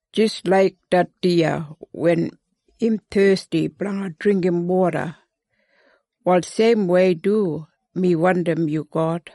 Jis laik det diya wen im thesti blanga dringgim woda, wal seimwei du mi wandim yu God.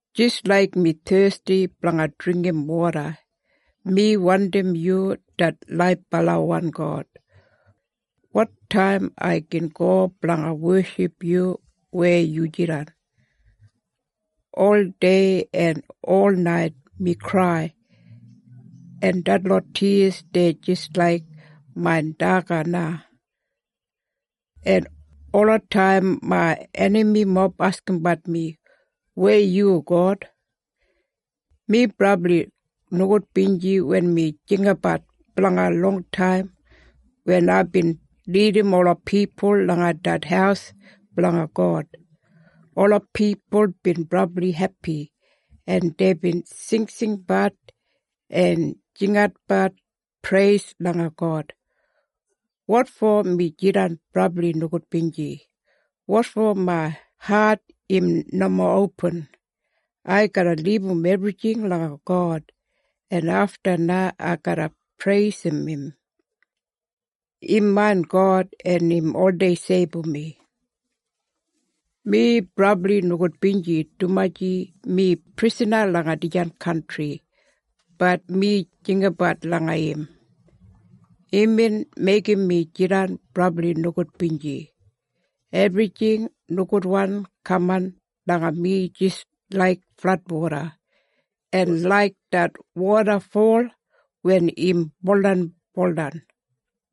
Jis laik mi thesti blanga dringgim woda, mi wandim yu, det laibalawan God. Wotaim ai gin go blanga weship yu weya yu jidan? Oldei en ol nait mi krai, en detlot tiyas dei jis laik main daga na. En olataim main enamimob askimbat mi, “Weya yu God?” Mi brabli nogudbinji wen mi jinggabat blanga longtaim wen aibin lidim ola pipul langa det haus blanga God. Ola pipul bin brabli hepi, en deibin singsingbat en jinginatbat preis langa God. Wotfo mi jidan brabli nogudbinji? Wotfo main hat im nomo opin? Ai garra libum ebrijing langa God, en afta na ai garra preisim im. Im main God, en im oldei seibum mi. Mi brabli nogudbinji dumaji mi prisana langa dijan kantri, bat mi jinggabat langa im. Imbin meigim mi jidan brabli nogudbinji. Ebrijing nogudwan kaman langa mi jis laik fladwoda, en laik det wodafol wen im buldanbuldan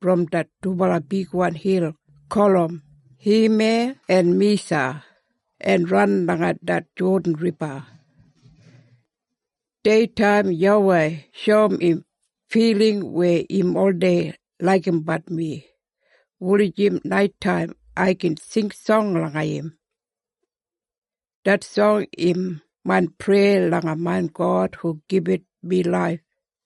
brom det dubala bigwan hil gulum Heman en Misa, en ran langa det Jodan Riba. Deitaim YAWEI shoum im filing weya im oldei laigimbat mi, wulijim naitaim ai gin sing song langa im. Det song im main preya langa main God hu gibit mi laif.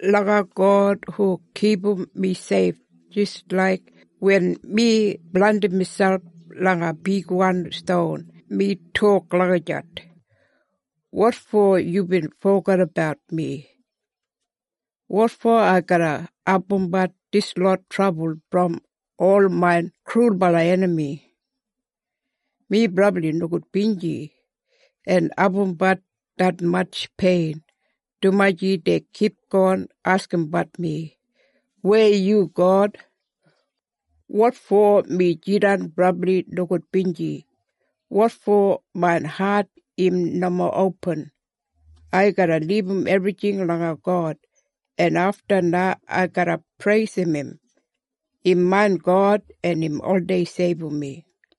Langa God hu kipum mi seif jis laik wen mi blandim miselp langa bigwan ston mi tok lagijat, “Wotfo yubin fogedabat mi? Wotfo ai garra abumbat dislot trabul brom ol main krulbala enami?” Mi brabli nogudbinji en abumbat detmatj pein, dumaji dei kipgon askimbat mi, “Weya yu God?” Wotfo mi jidan brabli nogudbinji? Wotfo main hat im nomo opin? Ai garra libum ebrijing langa God, en afta na ai garra preisim im. Im main God, en im oldei seibum mi.